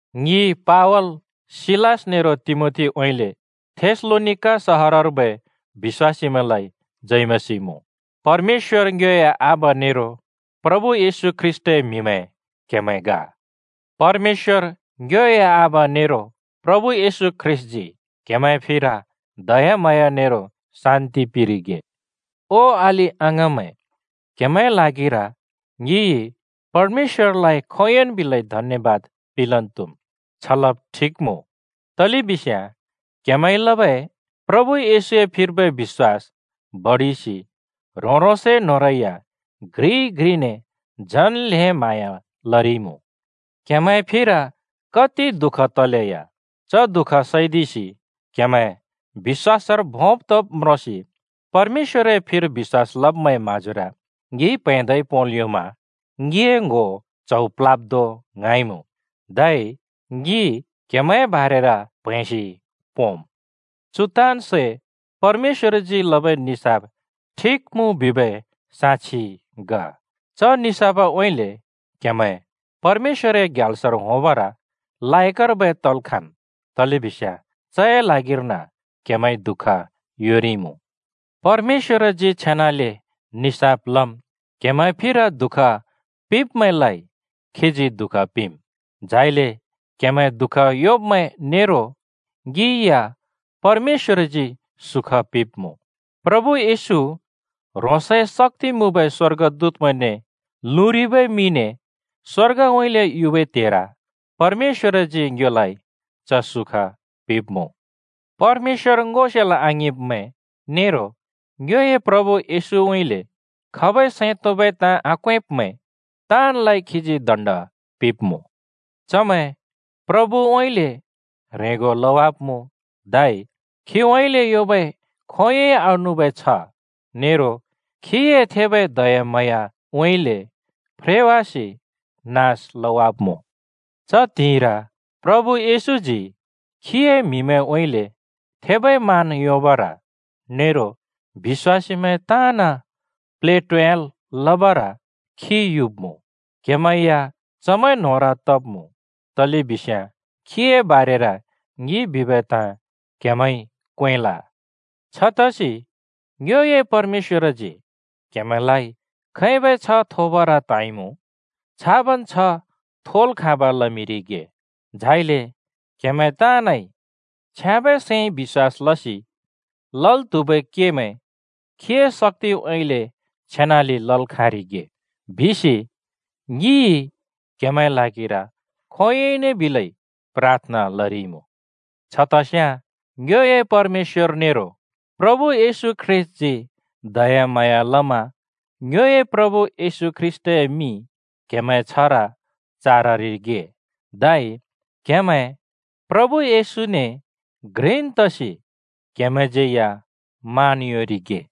ङि पावल, सिलास नेरो तिमोथीउँइँले थेसलोनिका सहरर्बै बिश्‍वासीमैंलाइ जय मसीह मुँ। क्हेमैं परमेश्‍वर ङ्योए आबा नेरो प्रभु येशू ख्रीष्‍टए म्हिमैं ग। परमेश्‍वर ङ्योए आबा नेरो प्रभु येशू ख्रीष्‍टजी क्‍हेमैंए फिर दयाम्हाँया नेरो शान्‍ति पिंरिगे। ओ अलि-अङाँमैं, क्‍हेमैंए ल्हागिर ङिइ परमेश्‍वरलाइ खोंयोंन् बिलै धन्‍यबाद पिंलन् त्‍हुम्। छ लब ठिक मुँ, तलेबिस्याँ क्हेमैंइ लबै प्रभु येशूए फिर्बै बिश्‍वास बडिसि ह्रों-ह्रोंसए न्होंरै या घ्रिइ घ्रिने झन् ल्हें म्हाँया लरिइमुँ। क्हेमैंए फिर कति दुःख तलेया च दुःख सैदिसि क्हेमैं बिश्‍वासर भोंब् तब् म्रोंसि परमेश्‍वरए फिर बिश्‍वास लब्मैंए म्हाँजोर ङिइ प्हैंदै पोंल् योंमा ङिए ङ्‍हो च्हौ प्ल्ह्‍याब् धों ङ्हाँइमुँ। धै ङि क्हेमैंए बारेर प्हैंसि पोंम्। चु ताँन् सै परमेश्‍वरजी लबै निसाफ ठिक मुँ बिबै साक्षि ग। च निसाफउँइँले क्‍हेमैं परमेश्‍वरए ग्याल्सर होंबर लायकर्बै तल् खाँम्, तलेबिस्याँ चए ल्हागिर्न क्हेमैंइ दुःख योंरिइमुँ। परमेश्‍वरजी छेनाले निसाफ लम्, क्‍हेमैंए फिर दुःख पिंब्‍मैंलाइ खीजी दुःख पिंम्, झाइले क्‍हेमैं दुःख योंब्‍मैं नेरो ङि या परमेश्‍वरजी सुख पिंब्‍मुँ। प्रभु येशू ह्रोंसए शक्‍ति मुँबै स्‍वर्गदूतमैंने लुँरिबै मिने स्‍वर्गउँइँले युबै त्हेर परमेश्‍वरजी ङ्योलाइ च सुख पिंब्मुँ। परमेश्‍वर ङो सेल् आङिंब्मैं नेरो ङ्योए प्रभु येशूउँइँले खबै सैं तोंबै ताँ आक्वेंब्‍मैं ताँनलाइ खीजी दण्ड पिंब्‍मुँ। चमैं प्रभुउँइँले ह्रेंगो लवाब्मुँ, धै खीउँइँले योंबै खोंयोंइ आनुबै छ्ह नेरो खीए थेबै दयाम्हाँयाउँइँले फ्रेवासि नास लवाब्मुँ। च त्हिंइर प्रभु येशूजी खीए म्‍हिमैंउँइँले थेबै मान योंबर नेरो बिश्‍वासीमैं ताँन प्लेटोयाल् लबर खी युब्‍मुँ। क्हेमैं या चमैं न्होंर तब्मुँ तलेबिस्याँ खीए बारेर ङिइ बिबै ताँ क्‍हेमैंइ क्वेंल। छतसि ङ्योए परमेश्‍वरजी क्‍हेमैंलाइ खैबै छ्ह थोबर त्‍हाँइमुँ छाबन् छ्ह थोल् खाँब लमिंरिगे, झाइले क्‍हेमैं ताँनइ छ्याँबै सैंइ बिश्‍वास लसि लल् त्हुबै केमैं खीए शक्‍तिउँइँले छेनाले लल् खाँरिगे बिसि ङिइ क्हेमैंए ल्हागिर खोंयोंइन बिलै प्राथना लरिइमुँ। छतस्याँ ङ्योए परमेश्‍वर नेरो प्रभु येशू ख्रीष्‍टजी दयाम्हाँया लमा ङ्योए प्रभु येशू ख्रीष्‍टए मिं क्हेमैंए छ्हर चाररिगे, धै क्हेमैं प्रभु येशूने घ्रिन् तसि क्‍हेमैंज्यैया मान योंरिगे।